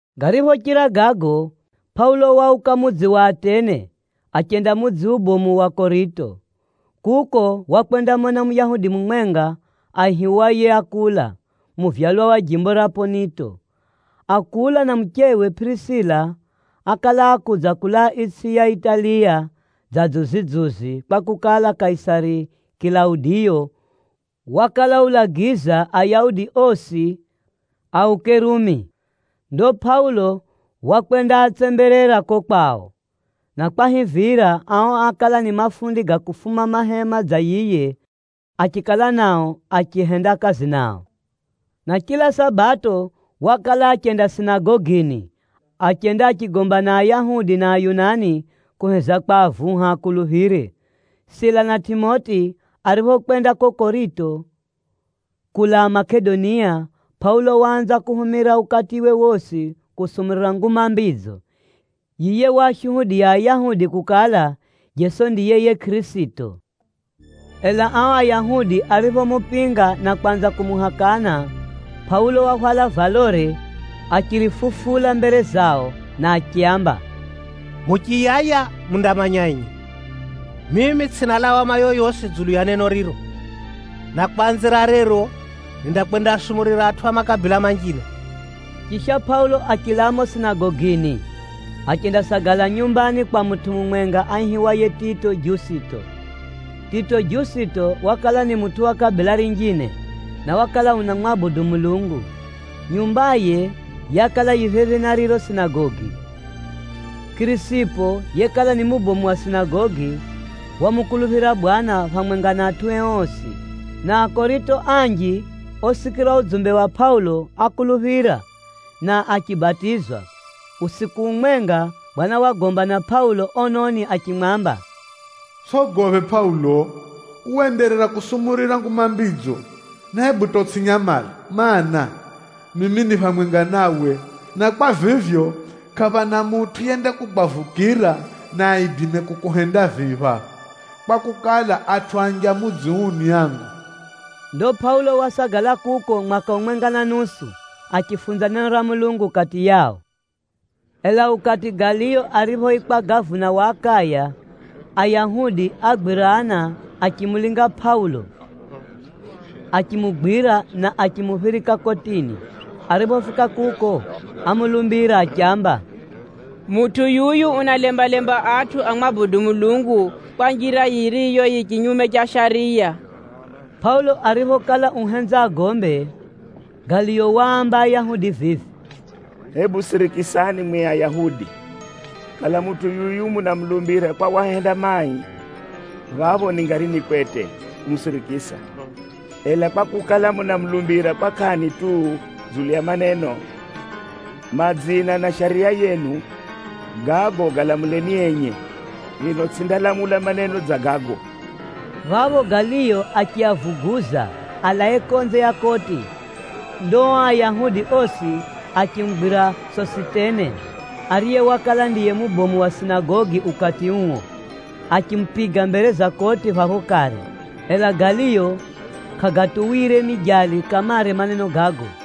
Gariphochira gago, Pʼaulo wauka mudzi wa Atene, achenda mudzi ubomu wa Korito. Kuko wakwendamona Muyahudi mumwenga aihiwaye Akula, muvyalwa wa jimbo ra Pʼonito. Akula na muchewe Pʼirisila ákala akudza kulaa itsʼi ya Italiya dza dzuzi-dzuzi, kwakukala, Kaisari Kilaudiyo wakala ulagiza Ayahudi osi auke Rumi. Rumi ni mudzi ubomu wa itsʼi ya Italiya. Ndo Pʼaulo wakwendaatsemberera ko kwao, na kwahivira, ao ákala ni mafundi ga kufuma mahema dza yiye, achikala nao achihenda kazi nao. Na chila Sabato wakala achenda sinagogini, achenda achigomba na Ayahudi na Ayunani kuheza kwavuha akuluphire. Sila na Tʼimoti ariphokwenda ko Korito kulaa Makedonia, Pʼaulo waanza kuhumira ukatiwe wosi kusumurira Nguma Mbidzo. Yiye waashuhudiya Ayahudi kukala, Jeso ndiye yiye Kʼirisito. Ela ao Ayahudi ariphomupinga na kwanza kumuhakana, Pʼaulo wahwala valore achirifufula mbere zao na achiaamba, “Muchiyaya mundamanya enye, mimi tsʼina lawama yoyosi dzulu ya neno riro. Na kwanzira rero, nindakwendaasumurira atʼu a makabila manjine.” Chisha, Pʼaulo achilaa mumo sinagogini, achendasagala nyumbani kwa mutʼu mumwenga aihiwaye Tito Jusito. Tito Jusito wakala ni mutʼu wa kabila rinjine, na wakala unamwabudu Mulungu. Nyumbaye yakala yi phephi na riro sinagogi. Kʼirisipo yekala ni mubomu wa sinagogi, wamukuluphira Bwana phamwenga na atʼue osi. Na Akorito anji osikira udzumbe wa Pʼaulo ákuluphira, na achibatizwa. Usiku umwenga, Bwana wagomba na Pʼaulo ononi achimwamba, “Utsʼogophe Pʼaulo! Uwe enderera kusumurira Nguma Mbidzo, na hebu hata utsʼinyamale. Maana, mimi ni phamwenga nawe, na kwa vivyo, kʼaphana mutʼu yendakugwavukira na aidime kukuhenda vii phapha, kwakukala, atʼu anji a mudzi uu ni angu.” Ndo Pʼaulo wasagala kuko mwaka umwenga na nusu, achifunza neno ra Mulungu kati yao. Ela ukati Galiyo ariphoikwa gavuna wa Akaya, Ayahudi ágwirana achimulinga Pʼaulo achimugwira, na achimuphirika kotini. Ariphofika kuko ámulumbira achiamba, “Mutʼu yuyu unaalembalemba atʼu amwabudu Mulungu kwa njira yiriyo yi chinyume cha shariya!” Pʼaulo ariphokala uhenza agombe, Galiyo waamba Ayahudi vivi, “Hebu sirikisani mwi Ayahudi! Kala mutʼu yuyu munamulumbira kwa wahenda mai, phapho ningari ni kwete kumusirikisa. Ela, kwakukala, munamulumbira kwa kʼani tu dzulu ya maneno, madzina na shariya yenu, gago galamuleni enye. Mino tsʼindalamula maneno dza gago!” Phapho Galiyo achiavuguza alae konze ya koti. Ndo o Ayahudi osi achimugwira Sositene, ariye wakala ndiye mubomu wa sinagogi ukati uo, achimupiga mbere za koti phapho kare. Ela Galiyo kʼagatuwire mijali kamare maneno gago.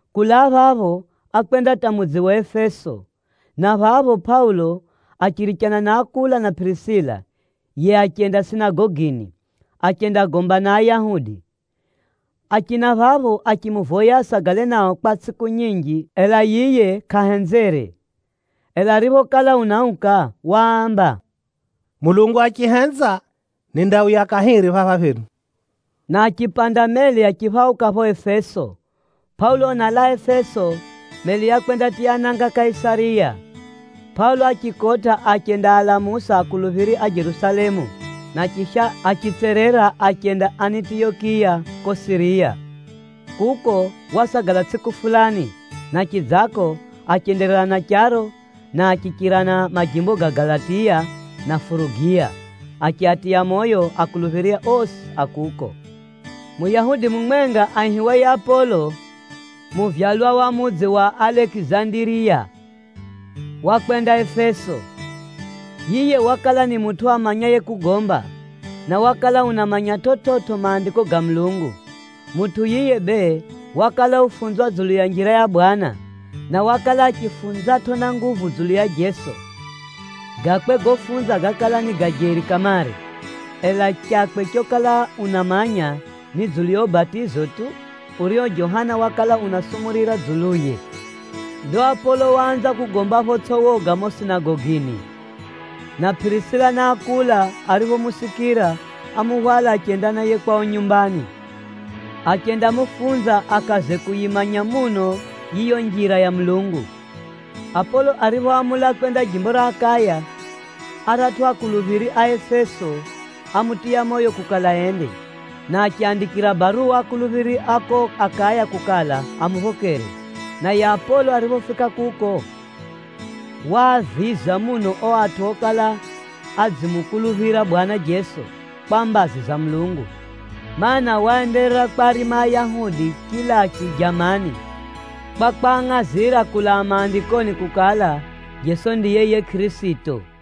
Kulaa phapho, ákwenda hata mudzi wa Efeso, na phapho Pʼaulo achirichana na Akula na Pʼirisila, yiye achenda sinagogini, achendagomba na Ayahudi. Achina phapho achimuvoya asagale nao kwa tsʼiku nyinji, ela yiye kʼahenzere. Ela ariphokala unauka, waamba, “Mulungu achihenza nindauya kahiri phapha phenu.” Na achipanda meli achiphauka pho Efeso. Pʼaulo unalaa Efeso, meli yakwendatiya nanga Kaisariya. Pʼaulo achikotʼa achendaalamusa akuluphiri a Jerusalemu, na chisha, achitserera achenda Anitiyokiya ko Siriya. Kuko, wasagala tsʼiku fulani, na chidzako achenderera na charo, na achichira na majimbo ga Galatiya na Furugiya, achiatiya moyo anafunzi osi a kuko. Muyahudi mumwenga aihiwaye Apolo, muvyalwa wa mudzi wa Alekizandiriya, wakwenda Efeso. Yiye wakala ni mutʼu amanyaye kugomba, na wakala unamanya chividzo Maandiko ga Mulungu. Mutʼu yiye bee, wakala ufunzwa dzulu ya Njira ya Bwana, na wakala achifunzatʼo na nguvu dzulu ya Jeso. Gakwe gofunza gákala ni ga jeri kamare. Ela chakwe chokala unamanya, ni dzulu ya ubatizo tu, urio Johana wakala unasumurira dzuluye. Ndo Apolo waanza kugomba photsʼi woga mumo sinagogini, na Pʼirisila na Akula ariphomusikira, ámuhwala achenda naye kwao nyumbani, achendamufunza akaze kuyimanya muno yiyo Njira ya Mulungu. Apolo ariphoamula kwenda jimbo ra Akaya, o atʼu a Mulungu kuko Efeso ámutiya moyo kukala ende na achiaandikira baruwa anafunzi kuko Akaya kukala, amuphokere. Naye Apolo ariphofika kuko, waaviza muno o atʼu okala adzimukuluphira Bwana Jeso kwa mbazi za Mulungu. Maana, waenderera kwarima Ayahudi chilachu jamani, kwa kwangʼazira kulaa Maandikoni kukala, Jeso ndiye yiye Kʼirisito.